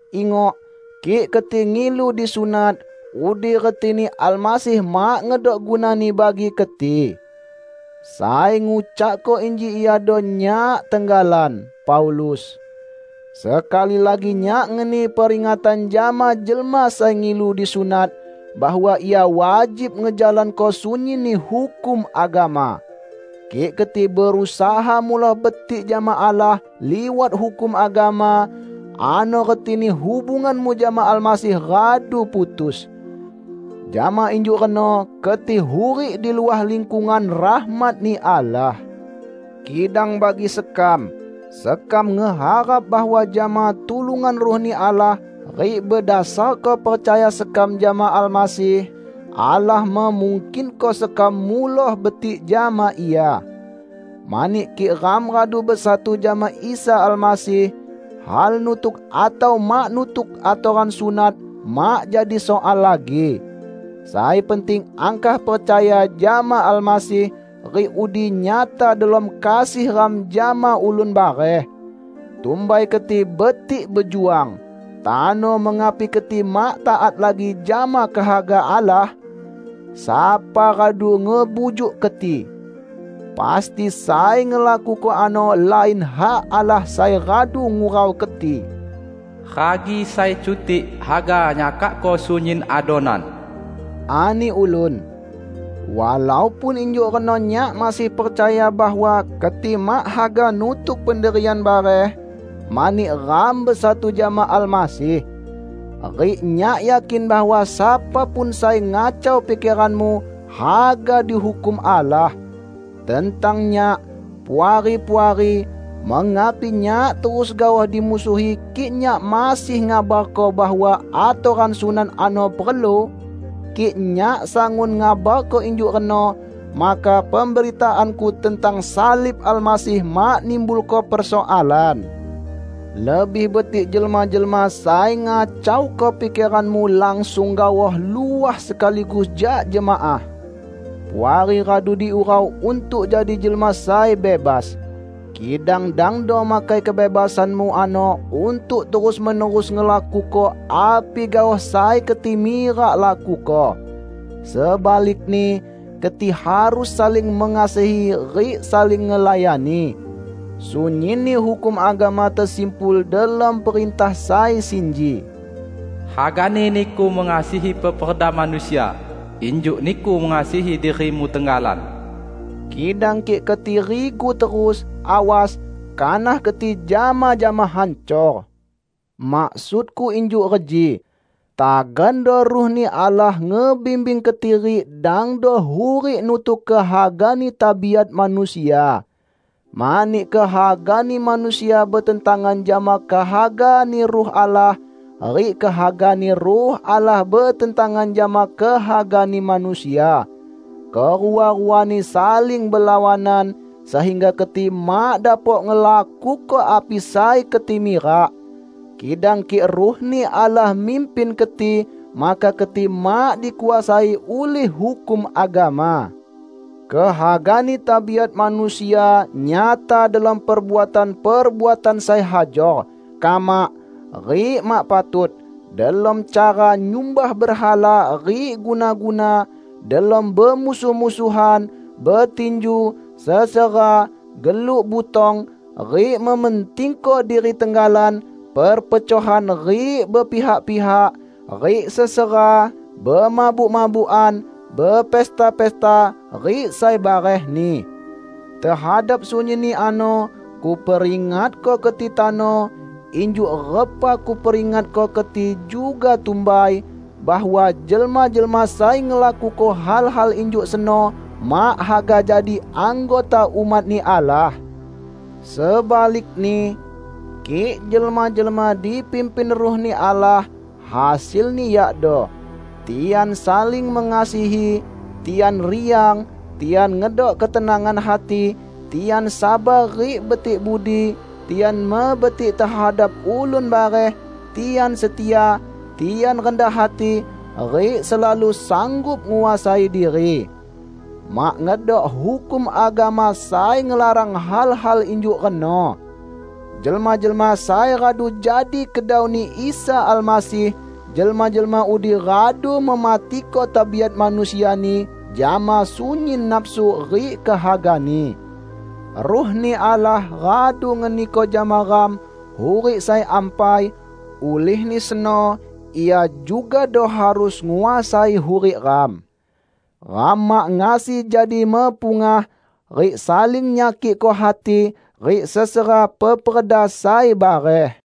Ingok, kik keti ngilu disunat, udi retini Almasih mak ngedok gunani bagi keti. Sai ngucakko inji iado nyak tenggalan, Paulus. Sekali lagi nyak ngeni peringatan jama jelma sai ngilu disunat, bahwa ia wajib ngejalanko sunyinni hukum agama! Kik keti berusaha muloh betik jama Allah liwat hukum agama, ano retini hubunganmu jama Almasih radu putus. Jama injuk reno keti hurik di luah lingkungan rahmat-Ni Allah. Kidang bagi sekam, sekam ngeharap bahwa jama tulungan Ruh-Ni Allah rik bedasarko percaya sekam jama Almasih, Allah memungkinko sekam muloh betik jama Ia. Mani kik ram radu besatu jama Isa Almasih, hal nutuk atau mak nutuk atoran sunat mak jadi soal lagi. Sai penting angkah percaya jama Almasih, rik udi nyata delom kasih ram jama ulun bareh. Tumbai keti betik bejuang! Tano mengapi keti mak taat lagi jama kehaga Allah? Sapa radu ngebujuk keti? Pasti sai ngelakuko ano lain hak Allah sai radu ngurau keti! "Ragi sai cutik haga nyakakko sunyin adonan," ani ulun. Walaupun injuk reno nyak masih percaya bahwa keti mak haga nutuk pendirian bareh, mani ram besatu jama Almasih. Rik nyak yakin bahwa sapa pun sai ngacau pikeranmu, haga dihukum Allah. Tentang nyak, Puari-puari, mengapi nyak terus gaoh dimusuhi kik nyak masih ngabarko bahwa atoran sunat ano perlu? Kik nyak sangun ngabarko injuk reno, maka pemberitaanku tentang salib Almasih mak nimbulko persoalan. Lebih betik jelma-jelma sai ngacauko pikeranmu langsung gaoh luah sekaligus jak jemaah! Puari radu diurau untuk jadi jelma sai bebas. Kidang dangdo makai kebebasanmu ano untuk terus-menerus ngelakuko api gaoh sai keti mirak lakuko. Sebalikni, keti harus saling mengasihi rik saling ngelayani. Sunyinni hukum agama tesimpul delom perintah sai sinji, "Hagani niku ngasihi peperda manusia injuk niku mengasihi dirimu tenggalan." Kidang kik keti rigu terus, awas, kanah keti jama-jama hancor. Maksudku injuk reji: Tagando Ruh-Ni Allah ngebimbing keti rik dangdo hurik nutuk kehagani tabiat manusia. Mani kehagani manusia betentangan jama kehagani Ruh Allah, rik kehaga-Ni Ruh Allah betentangan jama kehagani manusia. Kerua-ruani saling belawanan, sehingga keti mak dapok ngelakuko api sai keti mirak. Kidang kik Ruh-Ni Allah mimpin keti, maka keti mak dikuasai ulih hukum agama. Kehagani tabiat manusia nyata delom perbuatan-perbuatan sai hajor, kamak, rik mak patut; delom cara nyumbah berhala rik guna-guna; delom bemusuh-musuhan, betinju, sesera, geluk butong, rik mementingko diri tenggalan; perpecohan rik bepihak-pihak, rik sesera, bemabuk-mabukan, bepesta-pesta rik sai barehni. Tehadap sunyinni ano kuperingatko keti tano injuk repa kuperingatko keti juga tumbai, bahwa jelma-jelma sai ngelakuko hal-hal injuk seno mak haga jadi anggota umat-Ni Allah. Sebalikni, kik jelma-jelma dipimpin Ruh-Ni Allah, hasilni yakdo: Tian saling mengasihi, tian riang, tian ngedok ketenangan hati, tian sabar rik betik budi, tian mebetik tehadap ulun bareh, tian setia, tian rendah hati, rik selalu sanggup nguasai diri. Mak ngedok hukum agama sai ngelarang hal-hal injuk reno. Jelma-jelma sai radu jadi kedau-Ni Isa Almasih, jelma-jelma udi radu mematiko tabiat manusiani jama sunyin nafsu rik kehagani. Ruh-Ni Allah radu ngeniko jama ram hurik sai ampai; ulihni seno Ia jugado harus nguasai hurik ram. Ram mak ngasi jadi mepungah, rik saling nyakikko hati, rik sesera peperda sai bareh.